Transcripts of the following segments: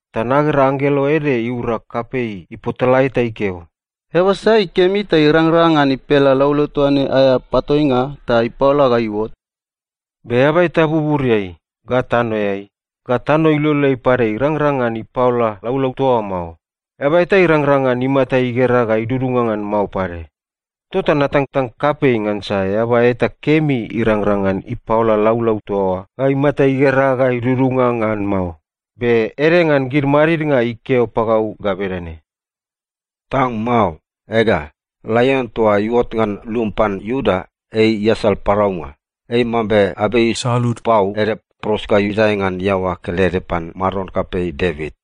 Ta nagera anggelo ede iura kapei ipotalae ta ikeo, “Eaba sai kemi ta irangrang ngan ipela laulau toa ne aea patoinga ta ipaola ga iuot?” Be eaba eta buburiai, ga tanoeai, ga tano iloleai pade irangrang ngan ipaola laulau toa oa mao. Eaba eta irangrang ngan imata igera ga idudunga ngan mao pade. Tota natangtang kapei ngansa eaba eta kemi irangrang ngan ipaola laulau toa oa ga imata igera ga idudunga ngan mao. Be ede ngan gid madidnga ikeo pagau ga bedane, “Tang mao. Ega, Laion toa iuot ngan lum pan Iuda, ei iasal paraunga. Ei mambe abei isalud pau ede pros ga idae ngan iaoa kelede pan maron kapei Devit.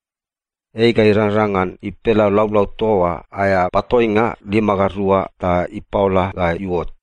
Ei ga irangrang ngan ipela laulau toa oa aea patoinga lima ga rua ta ipaola ga iuot.”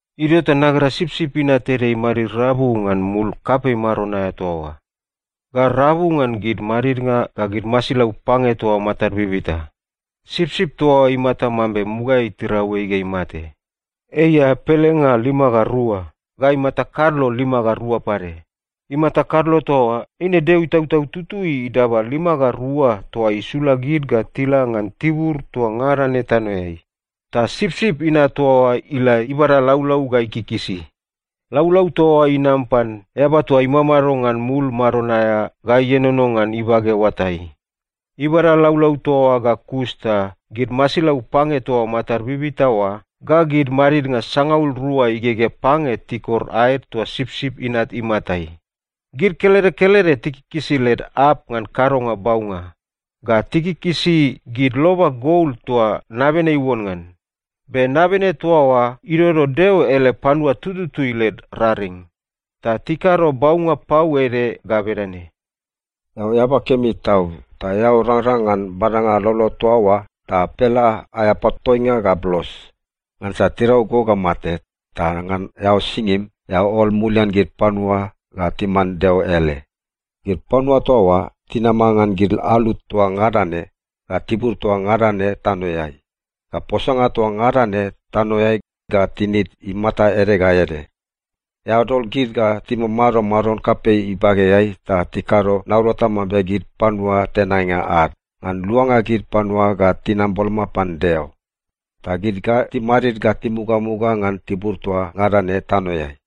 Idio ta nagera Sipsip Inat ede imadmadid rabu ngan mul kapei maron aea toa oa, ga rabu ngan gid madidnga ga gid masilau pange toa matad bibita. Sipsip toa oa imata mambe mugaeai tirau ei ga imate. Ei aea pelenga lima ga rua ga imata kadlo lima ga rua pade. Imata kadlo toa oa eine Deo Itautau Tutui idaba lima ga rua toa isula gid ga tila ngan tibur toa ngada ne tanoeai. Ta Sipsip Inat toa oa ila ibada laulau ga ikikisi. Laulau toa oa inam pan Eaba toa imamado ngan mul maron aea ga ienono ngan ibage oatai. Ibada laulau toa oa ga kus ta gid masilau pange toa matad bibita oa ga gid madidnga sangaul rua igegea pange tikor aed toa Sipsip Inat imatai. Gid kelede kelede tikikisi led arp ngan kadonga baunga, ga tikikisi gid loba gol toa nabene iuon ngan. Be nabene toa oa idodo Deo ele panua tututui led raring. Ta tikado baunga pau ede ga bedane, “Eao eaba kemi tau, ta eao rangrang ngan badanga laulau toa oa ta pela aea patoinga ga blos. Ngansa tirau go ga mate, ta ngan eao singim, eao ol mulian gid panua ga timan Deo ele. Gid panua toa oa tinama ngan gid alu toa ngada ne, ga tibur toa ngada ne tanoeai, ga posanga toa ngada ne tanoeai, ga tinid imata ede ga ede. Eao dol gid ga timamado Maron kapei ibageai ta tikado naurata mambe gid panua tenainga ad, ngan luanga gid panua ga tinam boloma pan Deo. Ta gid ga timadid ga timugamuga ngan tibur toa ngada ne tanoeai.”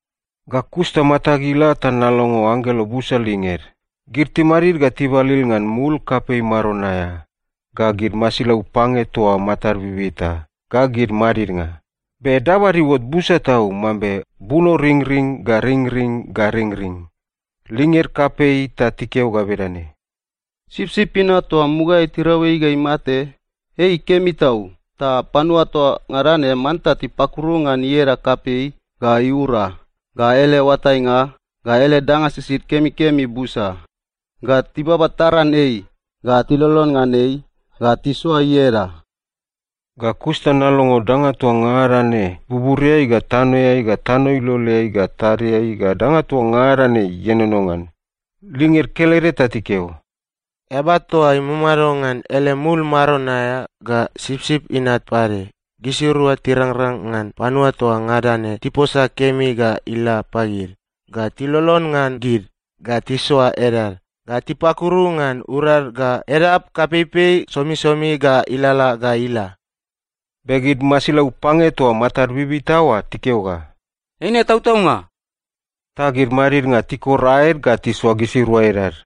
Ga kus ta matag ila ta nalongo anggelo busa linged. Gid timadid ga tibalil ngan mul kapei maron aea, ga gid masilau pange toa matad bibita, ga gid madidnga. Be dabad iuot busa tau, mambe bunoringring ga ringring ga ringring. Linged kapei ta tikeo ga bedane, “Sipsip Inat toa mugaeai tirau ei ga imate, ei kemi tau, ta gid panua toa ngada ne manta tipakuru ngan ieda kapei, ga iura, ga ele oatainga, ga ele danga sisid kemikemi busa, ga tibaba taran ei, ga tilolon ngan ei, ga tisoa ieda!” Ga kus ta nalongo danga toa ngada ne buburiai ga tanoeai ga tano iloleai ga tadiai ga danga toa ngada ne ienono ngan, linged kelede ta tikeo, “Eaba toa imamado ngan ele mul maron aea, ga Sipsip Inat pade, gisirua tirangrang ngan panua toa ngada ne tiposa kemi ga ila pagid, ga tilolon ngan gid, ga tisoa edad, ga tipakuru ngan urad ga edad kapeipei somisomi ga ilalala ga ila!” Be gid masilau pange toa matad bibita oa tikeo ga, “Eine tautaunga!” Ta gid madidnga tikor aed ga tisoa gisirua edad.